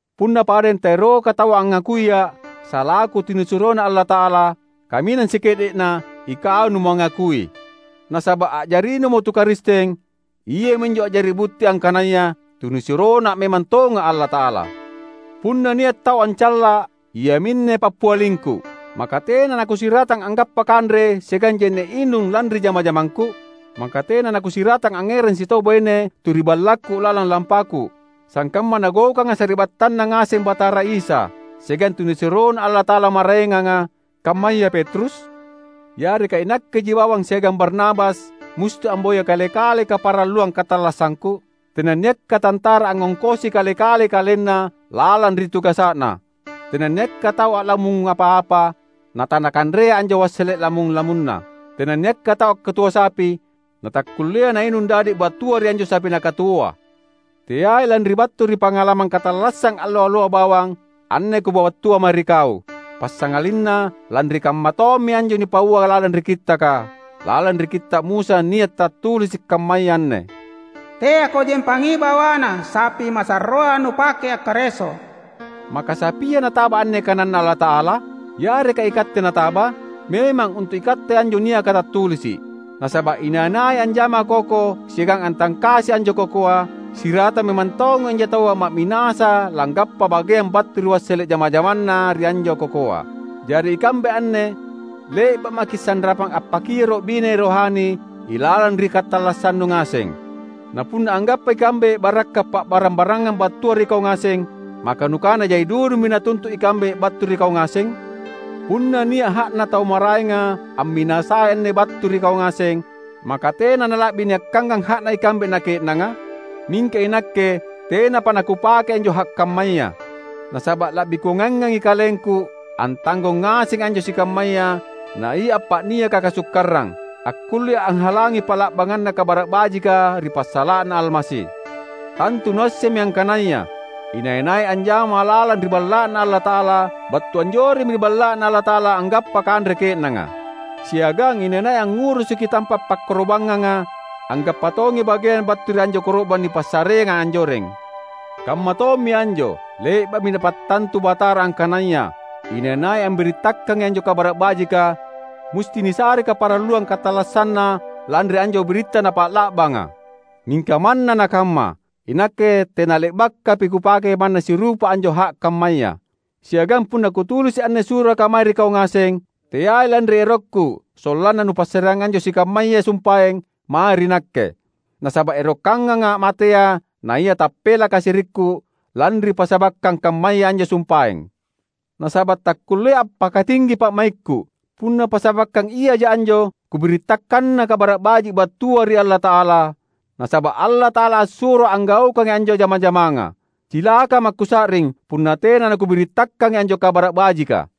Punna padeng taeroka taua angngakuia’ salaku tunisuroNa Allata’ala, kaminang sike’de’na ikau numangakui! Nasaba’ a’jarinumo tu Karisteng, iami anjo a’jari butti angkanaya tunisuroNa memang tonga’ Allata’ala. Punna nia’ tau ancalla’, iaminne pappialingku: Maka tena nakusiratang anggappa kanre siagang je’ne’ inung lanri jama-jamangku? Maka tena nakusiratang angngerang sitau baine tu ri ballakku lalang lampaku, sangkamma nagaukanga sari’battanNa ngaseng Batara Isa, siagang tunisuroNa Allata’ala maraenganga, kammaya Petrus? Yareka inakkeji bawang siagang Barnabas musti amboya kale-kalei kaparalluang katallassangku? Tenanniakka tantara angngongkosi kale-kalei kalenna lalang ri tugasa’na! Tenanniakka tau a’lamung apa-apa natanakanrea anjo wassele’ lamung-lamunna! Tenanniakka tau akkatuo sapi natakkullea nainung dadi’ battua ri anjo sapi nakatuoa! Teai lanri battu ri pangalamang katallassang allo-alloa bawang anne kupabattua mae ri kau; passangalinna lanri kammatommi anjo nipaua lalang ri Kittaka. Lalang ri Kitta’ Musa nia’ tattulisi’ kammaya anne, "Teako jempangi bawana sapi masarroa nupake akkareso." Maka sapia nataba anne kananNa Allata’ala? Yareka ikatte nataba? Memang untu’ ikatte anjo niaka tattulisi’. Nasaba’ inai-nai anjama koko siagang antangkasi anjo kokoa, siratang memang tongi anjo taua ma’minasa langgappa bageang battu ri wassele’ jama-jamanna ri anjo kokoa. Jari ikambe anne le’ba’ maki’ sanrapang appakioro’ bine rohani ilalang ri katallassannu ngaseng. Na punna anggappa ikambe barakka’ pa’barang-barangang battua ri kau ngaseng, maka nukana jai dudumi natuntu’ ikambe battu ri kau ngaseng? Punna nia’ ha’na tau maraenga amminasai anne battu ri kau ngaseng, maka tena nala’bi niakkangang ha’na ikambe na ke’nanga? Mingka inakke tenapa nakupakei anjo ha’ kammaya. Nasaba’ la’bi kungaiangangi kalengku antanggong ngasengi anjo sikammaya naia appa’niaka kasukkarang, akkullea anghalangi pa’la’banganna Kabara’ Bajika ri passala’na Almasi. Tantu nuassemmi angkanaya inai-nai anjama lalang ri Balla’Na Allata’ala, battu anjoremmi ri Balla’Na Allata’ala anggappa kanre ke’nanga. Siagang inai-nai angngurusuki tampa’ pakkoro’bangnganga, anggappa tongi bageang battu ri anjo koro’bang nipassareanga anjoreng. Kammatommi anjo, le’ba’mi Napattantu Batara angkanaya inai-nai ambirittakangi anjo Kabara’ Bajika, musti nisarei kaparalluang katallassanna lanri anjo biritta napa’la’banga. Mingka manna nakamma, inakke tenale’bakapi kupake manna sirupa anjo ha’ kammaya. Siagang punna kutulisi’ anne suraka mae ri kau ngaseng, teai lanri erokku sollanna nupassareang anjo sikammaya sumpaeng mae ri nakke. Nasaba’ erokanganga’ matea naia tappelaka sirikku lanri passabakkang kammaya anjo sumpaeng. Nasaba’ takkullea’ ampakatinggi pa’maikku punna passabakkang iaja anjo kubirittakanna Kabara’ Baji’ battua ri Allata’ala; nasaba’ Allata’ala assuroa’ anggaukangi anjo jama-jamanga. Cilakama’ kusa’ring punna tena nakubirittakangi anjo Kabara’ Bajika!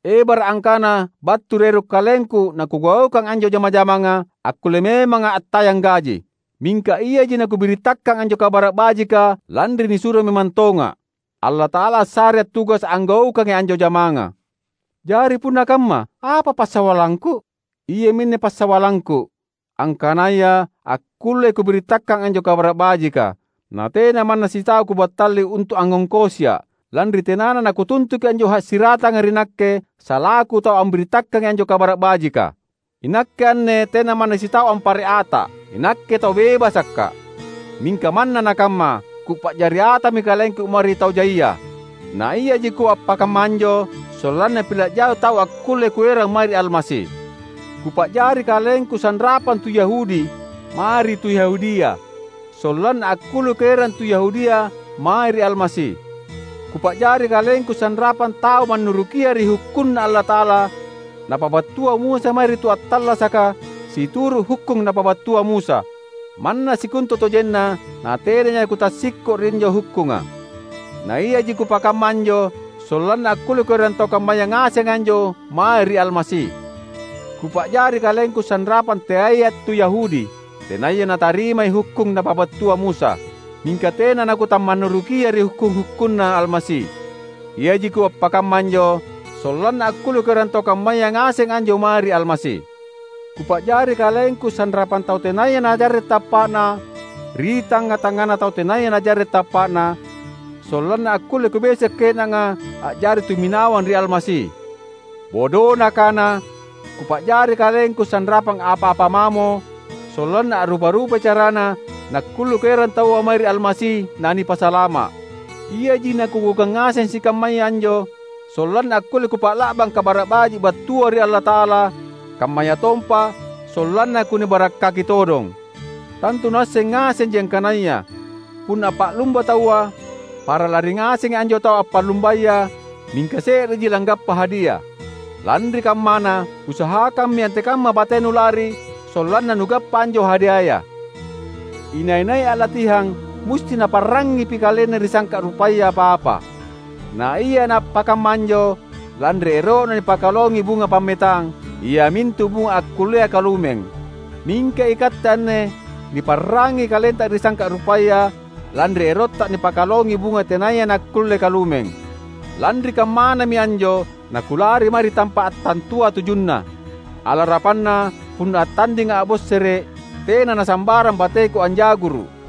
Ebara’ angkana battu ri ero’ kalengku nakugaukang anjo jama-jamanga, akkulle memanga’ attayang gaji. Mingka iaji nakubirittakang anjo Kabara’ Bajika lanri nisuro memang tonga’. Allata’ala assarea’ tugasa’ anggaukangi anjo jamanga. Jari punna kamma apa passawallangku? Iaminne passawallangku: angkanaya akkullei kubirittakang anjo Kabara’ Bajika, natena manna sitau kubattali untu’ angngongkosia’, lanri tenana nakutuntuki anjo ha’ siratanga ri nakke salaku tau ambirittakangai anjo Kabara’ Bajika. Inakke anne tena manna sitau ampare’ ata’; inakke tau bebasakka’. Mingka manna nakamma, kupa’jari atami kalengku mae ri tau jaia. Naiaji kuappakamma anjo sollanna pila’ jai tau akkulle kuerang mae ri Almasi. Kupa’jari kalengku sanrapang tu Yahudi mae ri tu Yahudia, sollanna akkulle kuerang tu Yahudia mae ri Almasi. Kupa’jari kalengku sanrapang tau mannurukia ri hukkunna Allata’ala napabattua Musa mae ri tu attallasaka situru’ hukkung napabattua Musa; manna sikontutojenna natenaja kutassikko’ ri anjo hukkunga. Naiaji kuappakamma anjo, sollanna akkulle kuerang tau kammaya ngaseng anjo mae ri Almasi. Kupa’jari kalengku sanrapang teaia’ tu Yahudi, tenaya natarimai hukkung napabattua Musa. Mingka tena nakutamannurukia ri hukkung-hukkunNa Almasi. Iaji kuappakamma anjo sollanna akkulle kuerang tau kammaya ngaseng anjo mae ri Almasi. Kupa’jari kalengku sanrapang tau tenaya najarre’ tappa’na ri tangnga-tangngana tau tenaya najarre’ tappa’na, sollanna akkulle kubeso’ ke’nanga a’jari tumminawang ri Almasi. Bodona kana, kupa’jari kalengku sanrapang apa-apa mamo, sollanna a’rupa-rupai carana nakkulle kuerang taua mae ri Almasi nanipasalama’. Iaji nakugaukang ngaseng sikammaya anjo, sollanna akkulle kupa’la’bang Kabara’ Baji’ battua ri Allata’ala, kammayatompa sollanna kunibarakkaki todong. Tantu nuasseng ngasenji angkanaya punna appa’lumba taua, para lari ngasengi anjo tau appa’lumbaya; mingka se’reji langgappa hadia. Lanri kammana, usahakammi antekamma batenu lari sollanna nugappa anjo hadiaya. Inai-nai a’latihang, musti naparrangngipi kalenna ri sangka’ rupaya apa-apa. Naia naappakamma anjo lanri ero’na nipakalongi bunga pammetang, iamintu bunga akkullea kalumeng. Mingka ikatte anne niparrangngi kalenta ri sangka’ rupaya lanri erotta nipakalongi bunga tenaya nakkulle kalumeng. Lanri kammanami anjo nakulari mae ri tampa’ attantua tujunna. Alarapanna punna attandinga’ a’bossere’, tena nasambarang bateku anja’guru’.